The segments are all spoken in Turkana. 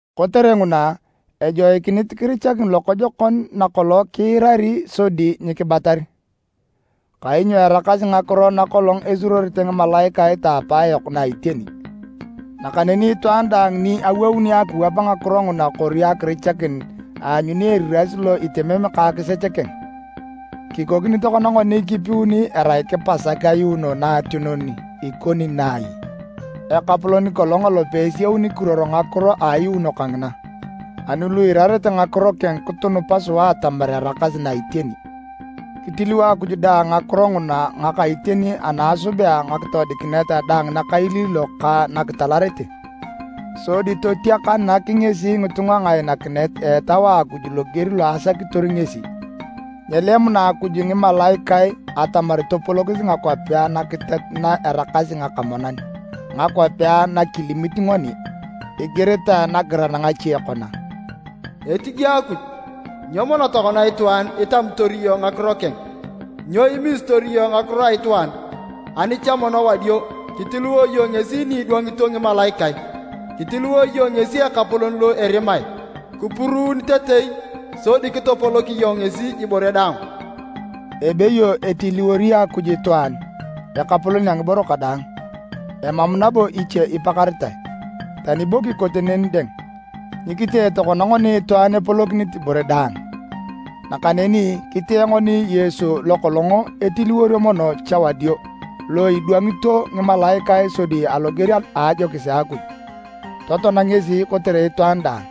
Kotere nguna, ejoikinit kirichakini lokojokon na kolong kiirari sodi nyikibatar. Kainyo araakasi ngakiro na kolong esuruorete ngimalaikae ta apaayok na iteni. Nakaneni itwaan daang ni awouni akiwap ngakiro nguna kori akirichakin, aanyuni eriras lo etemem ka akisech keng. Kikokini tokona ngoni kipuun erai kipasak ayuuno naationon ikoni na ai? Ekapolon kolong elope esiauni kiruor ngakiro a ayuuno kangina. Ani lu eirarete ngakiro keng kitunupa sua atamar eraakasi na iteni. Kitiliwo Akuj dang ngakiro nguna ngaka iteni ani asubea ngakitoodikinet daang nakailiilok ka nakitalarete. Sodi totiakanak ngesi ngitunga ngainakinet a Etau a Akuj loger lo asakitor ngesi. Nyelemuna Akuj ngimalaikae atamar topolokis ngakwapea nakiteat na eraakasi ngaka monan, ngakwapea na kilimit ngoni. Igiritae nagiran ngache kona, “Etige Akuj, nyo mono tokona itwaan itamitor iyong ngakiro keng? Nyo imisitor iyong ngakiro a itwaan? Ani cha mono wadio, kitiliwo iyong ngesi ni idwangito ngimalaikae. Kitiliwo iyong ngesi Ekapolon lo erimae, kipuruunitetei. Sodi kitopolok iyong ngesi ibore daang.” Ebeyo etiliwori Akuj itwaan “ekapolon a ngiboro kadaang,” emam nabo iche ipakaritae. Tani bo kikote neni dang, nyikitee tokona ngoni itwaan epolokinit ibore daang. Nakaneni kitee ngoni Yesu lo kolong etiliworio mono cha wadio lo idwangito ngimalaikae sodi aloger a ajokis a Akuj, totoan ngesi kotere itwaan daang.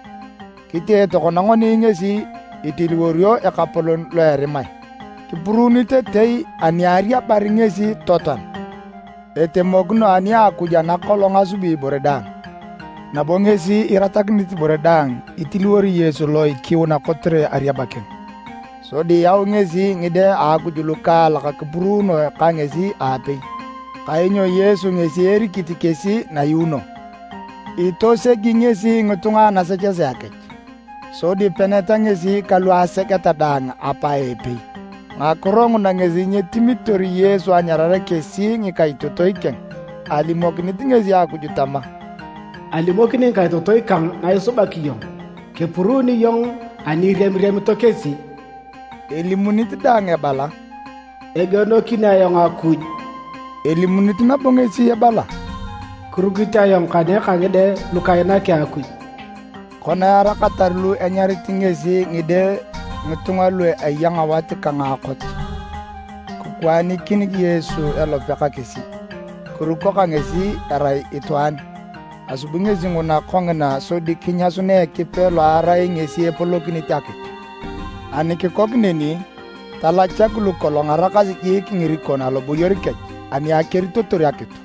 Kitee tokona ngoni ngesi itiliworio ekapolon lo erimae, kipuruunitetei ani ariabar ngesi totoan. Etemokino ani Akuj ana kolong asubi ibore daang, nabo ngesi iratakinit ibore daang itiliwori Yesu lo ikiuna kotere ariaba keng. Sodi yau ngesi ngide a Akuj lukaalak kipuruunoe ka ngesi aapei. Kainyo Yesu ngesi erikit kesi nayuuno. Itosegi ngesi ngitunga anasechesea kech, sodi peneta ngesi kalu asegeta daang Apa epei. Ngakiro nguna ngesi nyitimitor Yesu anyarare kesi ngikaitotoi keng. Alimokinit ngesi Akuj tama, “Alimokini ngikaitotoi kang na isubak iyong. Kepuruuni iyong ani iriamiriamito kesi.” Elimunit dang ebala, “Egienokin ayong Akuj.” Elimunit nabo ngesi ebala, “Kirukit ayong kane ka ngide lu kainaki Akuj.” Kona eraakatar lu enyarit ngesi ngide ngitunga lu eya ngawat ka ngaakot, kikwaanikin Yesu elope ka kesi, kiruko ka kesi erai itwaan. Asubi ngesi nguna kongina sodi kinyasunea Ekipe lo erai ngesi epolokinit akitu ani kikok neni talachak lu kolong araakasi jiik ngirikon aloboyor kech ani akeritotor akitu.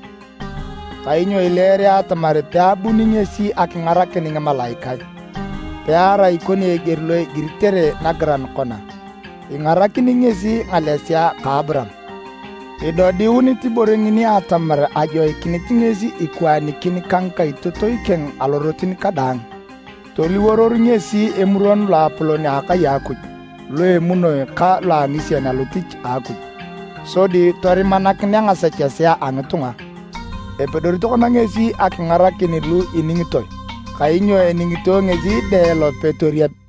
Kainyo ileere atamar peabuni ngesi akingarakin ngimalaikae, pearai ikoni eger lo igiritere nagiran kona, “Ingarakini ngesi ngalesea ka Aburaam.” Idodiunit ibore ngini atamar ajoikinit ngesi ikwaanikin ka ngikaitotoi keng alorotin kadaang. Toliworor ngesi Emuron Loapolon a akai a Akuj lo emunoi ka lo angisien alotich a Akuj, sodi torimakinere ngasechesea a ngitunga. Epedori tokona ngesi akingarakin lu iningitoe, kainyo eningitoe ngesi dang elope torieb.